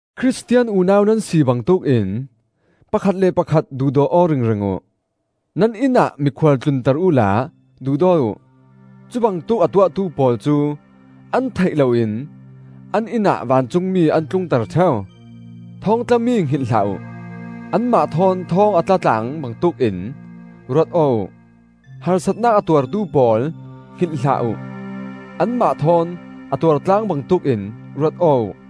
Khristian unau nan si bangtuk in pakhat le pakhat duhdaw aw ringring uh. Nan innah mikhual tlunter uhla duhdaw uh. Cubangtuk a tuahtu pawl cu an theih loin an innah vancungmi an tlungter ṭheu. Thawngtlami hngilh hlah uh; anmah thawn thawng a tla tlaang bangtuk in ruat aw uh. Harsatnak a tuartu pawl hngilh hlah uh; anmah thawn a tuar tlaang bangtuk in ruat aw uh.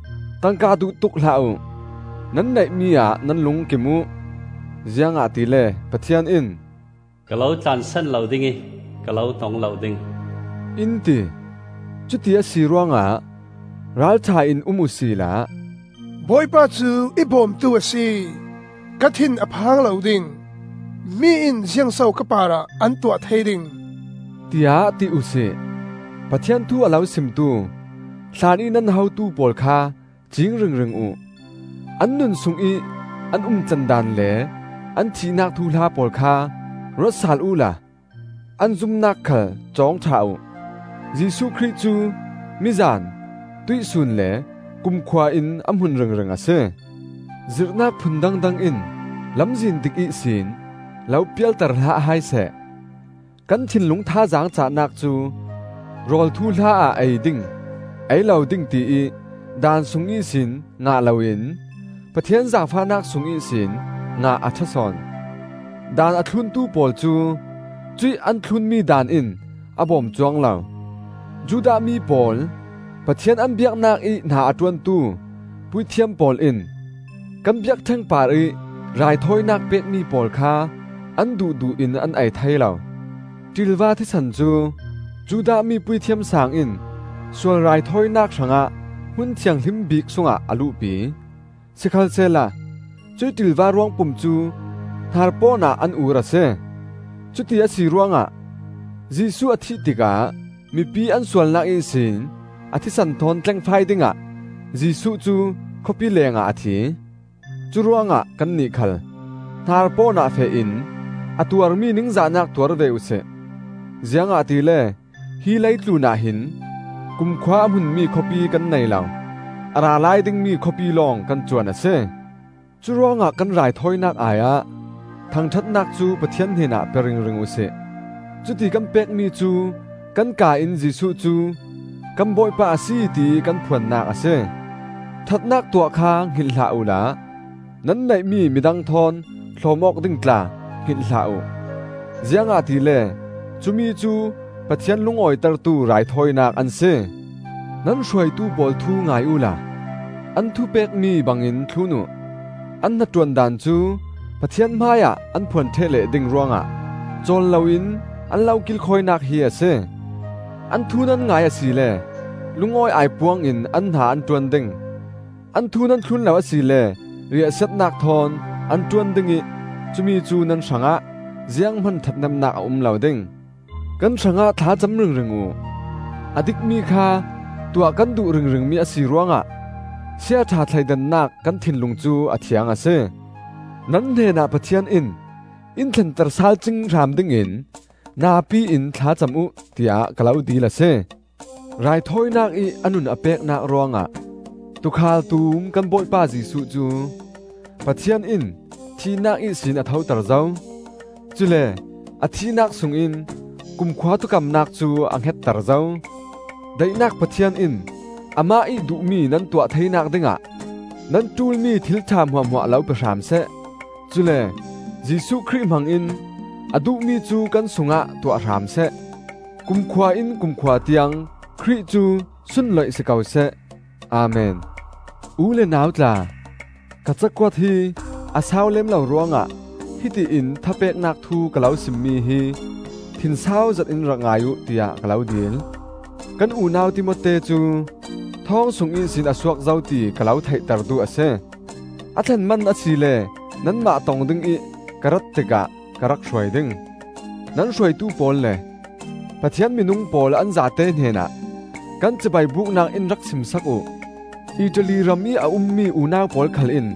Tangka duh tuk hlah uh; nan neihmi-ah nan lung kim uh. Ziangahtile Pathian in, “Ka lo tlansan lo ding ih ka lo hnong lo ding,” in ti. Cuti a si ruangah ralṭha in um uhsila, “Bawipa cu i bawmtu a si, ka thin a phang lo ding. Mi in ziangso ka parah an tuah thei ding?” tiah ti uhsi. Pathian thu a lo simtu, hlanih nan hotu pawl kha ciing ringring uh. An nun sungih an umtlandan le an thihnak thuhla pawl kha ruat saal uhla an zumnak khal cawng ṭha uh. Jesuh Khrih cu mizan, tuihsun le kumkhua in a hmun ringring a si. Zirhnak phun dangdang in lamzin dik ihsin lo pialter hlah hai seh. Kan thinlung thazaang cahnak cu, rawl thuhla ah ei ding, ei lo ding tiih daan sung ihsin ngah loin, Pathian zaangfahnak sung ihsin ngah a ṭha sawn. Daan a thluntu pawl cu cuih an thlunmi daan in a bawm cuang lo. Judah mi pawl Pathian an biaknak ih hna a ṭuantu puithiam pawl in kan biakṭheng parih raithawinak pekmi pawl kha an duhduh in an ei thei lo. Ṭilva thisen cu Judah mi Puithiam Saang in sual raithawinak hrangah Hmun Thianghlim Bik sungah a luhpi; sikhalsehla cuih ṭilva ruangpum cu hnarpawn ah an ur a si. Cuti a si ruangah Jesuh a thih tikah mipi an sualnak ihsin a thisen thawn tlengfai dingah Jesuh cu khawpi lengah a thi. Curuangah kannih khal hnarpawn ah feh in a tuarmi ningzahnak tuar ve uhsi. Ziangahtile hi leitlunah hin kumkhua a hmunmi khawpi kan nei lo; a ra lai dingmi khawpi lawng kan cuan a si. Curuangah kan raithawinak ai-ah thangṭhatnak cu Pathian hnenah pe ringring uhsi; cuti kan pekmi cu kan kaa in Jesuh cu kan Bawipa a si tiih kan phuannak a si. Ṭhatnak tuah kha hngilh hlah uhla, nan neihmi midang thawn hlawm-awk ding tla hngilh hlah uh; ziangahtile cumi cu Pathian lungawitertu raithawinak an si. Nan hruaitu pawl thu ngai uhla an thu pekmi bangin thlun uh. An hnaṭuan daan cu Pathian hmaiah an phuan ṭheh leh ding ruangah cawl loin an lo kilkhawinak hi a si. An thu nan ngai asile lungawi aipuang in an hna an ṭuan ding; an thu nan thlun lo asile riahsiatnak thawn an ṭuan ding ih cumi cu nan hrangah zianghman ṭhathnemnak a um lo ding. Kan hrangah thla cam ringring uh. A dikmi kha tuah kan duh ringringmi a si ruangah siaṭha thleidannak kan thinlung cu a thiang a si. Nan hnenah Pathian in in thlenter sal cing hram dingin napi in thlacam uh, tiah ka lo dil a si. Raithawinak ih a nun a peknak ruangah Tuukhal Tum kan Bawipa Jesuh cu Pathian in thihnak ihsin a thoter zo; cule a thihnak sungin kumkhua thukamnak cu a hngetter zo. Daihnak Pathian in amah ih duhmi nan tuah theinak dingah nan ṭulmi thilṭha hmuahhmuah lo pe hram seh; cule Jesuh Khrih hmangin a duhmi cu kan sungah tuah hram seh. Kumkhua in kumkhua tiang Khrih cu sunloih si ko seh! Amen. U le nau tla, ka cakuat hi a sau lem lo ruangah hiti in thapeknak thu ka lo simmi hi thinsau zetin rak ngai uh, tiah ka lo dil. Kan unau Timote cu thawng sung ihsin a suak zo ti ka lo theihter duh a si. A thlen man asile nanmah tong dingih ka rat tikah ka rak hruai ding. Nan hruaitu pawl le Pathian minung pawl an zate hnenah kan cibai buknak in rak sim sak uh. Italy ramih a ummi unau pawl khal in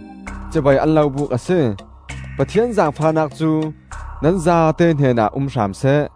cibai an lo buk a si. Pathian zaangfahnak cu nan zate hnenah um hram seh.